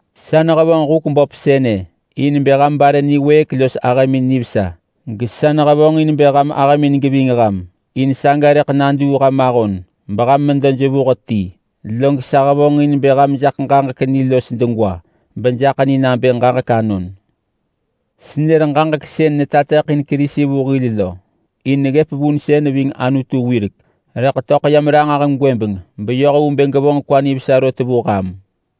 Sa nehevonġ huk böp sënë in bë ham bare niwëëk los ahëmin nivesa, gesa nehevonġin bë ham ahëmin geving ham, in saga rëḳ naduu ham ahon beham medo jevuh ti. Log sa hevonġin bë ham jaḳ ġaġek ni los degwa, bejaḳ ni nabë ġaġek anon. Senër ġaġek sën netateḳin Kerisi vu hil lo. In neggëp vunsën ving Anutu wirek, rëḳ töḳ yam ranġah gwëbeng beyoh vu bë gevonġ kwa nivesa rot vu ham.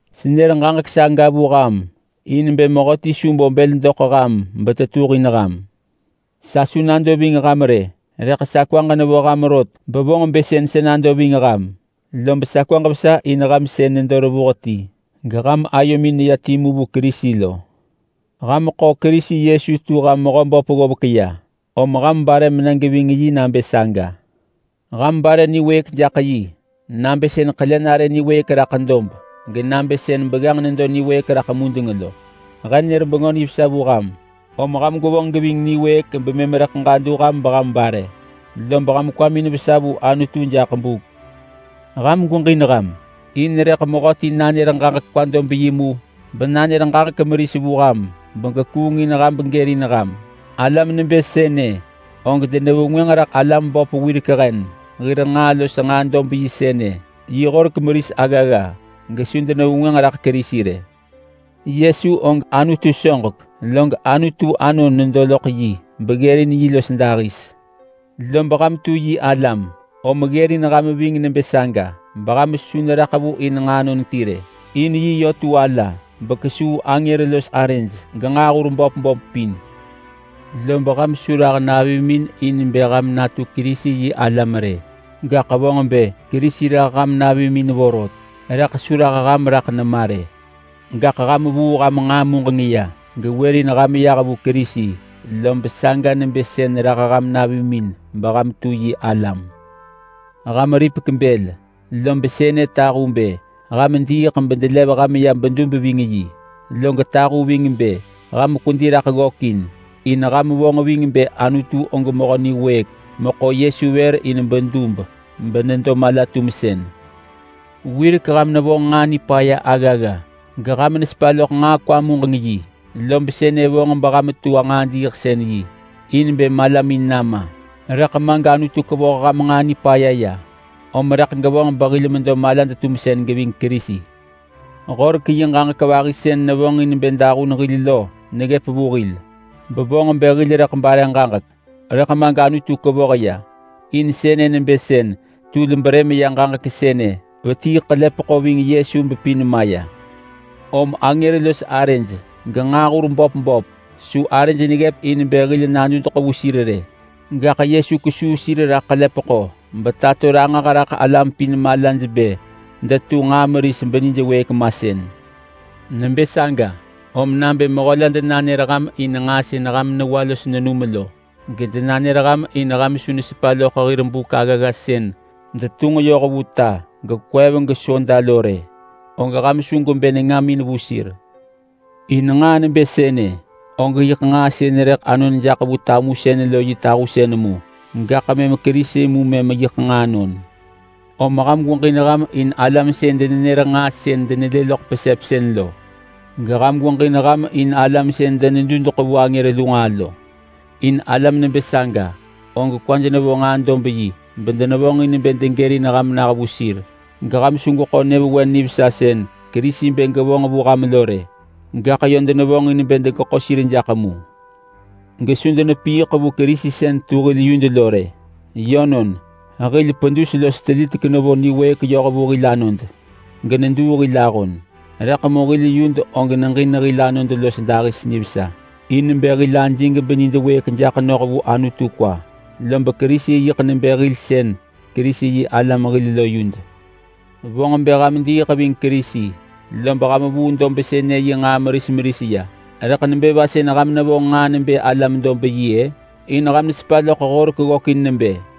Senër ġaġek saga vu ham in bë mehöti su bo bël doḳ ham betetuhin ham. Sa su nado ving ham rë, rëḳ sa kwaġ nevo ham rot bevonġ bë sën sa nado ving ham, lob sa kwaġ vesa in sën ham nedo revuh ti geham ayomin neya timu vu Kerisi lo. Ham ḳo Kerisi Yesu tu ham Mehöböp ggovek ya, om ham bare mena geving yi nabë saga. Ham bare niwëëk jaḳ yi, nabë sën ḳele nare niwëëk raḳ dob, genabë sën begganġ nedo niwëëk raḳ mudeng lo. He nër Bengö Nivesa vu ham, om ham gwevonġ geving niwëëk bemëm rëḳ ġadu ham beham bare, lob ham kwamin vesa vu Anutu jaḳ buk. Ham gweġin ham. In rëḳ mehöti nanër ġaġek kwa dob yi mu benanër ġaġek meris vu ham begekuung in ham begërin ham. Alam nebë sënë og denevengwënġ raḳ alam böp wirek hen hir nġaa los nġaa dob sënë yi horek meris aggagga, gesu denevengwënġ raḳ Kerisi rë. Yesu og Anutu soġek, log Anutu Anon nedo loḳ yi beggërin yi los dahis. Lob ham tu yi alam, om ggërin ham ving nebë saga beham su neraḳ vu in nġaanon ti rë. In yi yö tu ala bekesuu angër los arëj genġaahur böp böp pin. Lob ham su rah navimin in bë ham natu Kerisi-yi-alam rë, gaḳ vonġ bë Kerisi rah ham navimin vorot, rëḳ su rah ham raḳ nema rë. Gaḳ ham vuu ham nġaa muġeng ya gewërin ham yah vu Kerisi, lob saga nebë sën rah ham navimin beham tu yi alam. Ham ripek bël, lob sënë tahu bë ham diiḳ bedelev ham ya bedub ving yi. Log tahu ving bë ham kwedi raḳ ggökin, in ham vonġ ving bë Anutu og mehö niwëëk meḳo Yesu vër in bedub benedo mala-tumsën. Wirek ham nevonġ nġaa nipaya aggagga, geham nesepa loḳ nġaa kwa-muġeng-yi, lob sënë vonġ beham tu nġaa diiḳsën-yi in bë malamin nama. Rëḳ ma gAnutu kevoh ham nġaa nipaya ya, om rëḳ gevonġ behil medo malad-tumsën geving Kerisi. Horek yi ġaġek vahi sën nevonġin bë dahun hil lo neggëp vu hil, bevonġ bë hil rëḳ bare ġaġek, rëḳ ma gAnutu kevoh ya. In sënë nebë sën tul brëm ya ġaġek sënë vetii ḳelepeḳo ving Yesu bepin maya. Om angër los arëj genġaahur böp böp su arëj neggëp in bë hil nadudeḳ vu sir rë. Gaḳ Yesu kesuu sir raḳ ḳelepeḳo betato ranġah raḳ alam pin malaj bë detu nġaa meris benijwëëk masën. Nebë saga, om nabë mehö la denanër ham in nġaa sën ham newa los nenum lo, gedenanër ham in ham su nesepa loḳ hir buk aggagga sën detunġ yoh vu ta gekwev gesoda lo rë, og ham su gwebë nengamin vu sir. In nġaa nebë sënë og yiḳ nġaa sën rëḳ anon jaḳ vu tamusën lo yi tahusën mu. Gaḳ mëm Kerisi mu mëm yiḳ nġaanon. Om ham gweġin ham in alam sën denenër nġaa sën denelë loḳ pesepsën lo. Geham gweġin ham in alam sën denedudeḳ vu angër lu nġaa lo. In alam nebë saga og kwaj nevo nġaa dob yi bedenevonġin bë degërin ham nah vu sir, geham su gweḳo nyëvewen nivesa sën Kerisi bë gevonġ vu ham lo rë. Gaḳ yö devonġin bë degeḳo sir jaḳ mu, gesu denepiiḳ vu Kerisi sën tu hil yud lo rë. Yönon, hil pedus los telitek nevo niwëëk yoh vu hil anod geneduu hil ahon. Rëḳ mu hil yud og neġin hil anod los dahis nivesa in bë hil ajig benid wëëk jaḳ noh vu Anutu kwa. Lob Kerisi yiḳ nebë hil sën Kerisi-yi-alam hil lo yud. Vonġ bë ham diiḳ ving Kerisi, lob ham vuu dob sënë yi nġaa meris meris ya. Rëḳ nebë va sën ham nevonġ nġaa nebë alam-dob-yi-ë? In ham nesepa loḳ Horek ggökin nebë,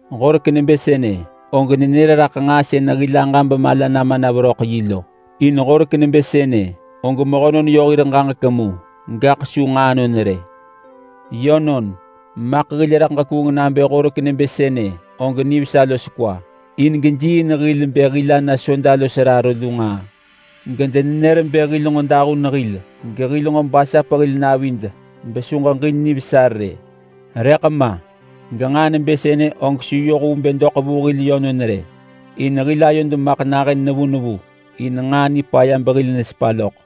Horek nebë sënë og nenër raḳ nġaa sën hil aġa bemala nama na veröḳ yi lo. In horek nebë sënë og mehönon yö hir ġaġek mu, gaḳ su nġaanon rë. Yönon, maḳ hil rëḳ ġekuung nabë horek nebë sënë og nivesa los kwa. In gejiiin hil bë hil ana soda los raro lu nġaa, gedenenër bë hil nġo dahun hil gehil nġo basap hil navid besu ġeġin nivesa rë. Rëḳ ma, genġaa nebë sënë og su yoh vu bë doḳ vu hil yönon rë, in hil ayod maḳ nahën nevu nevu in nġaa nipaya behil nesepa loḳ.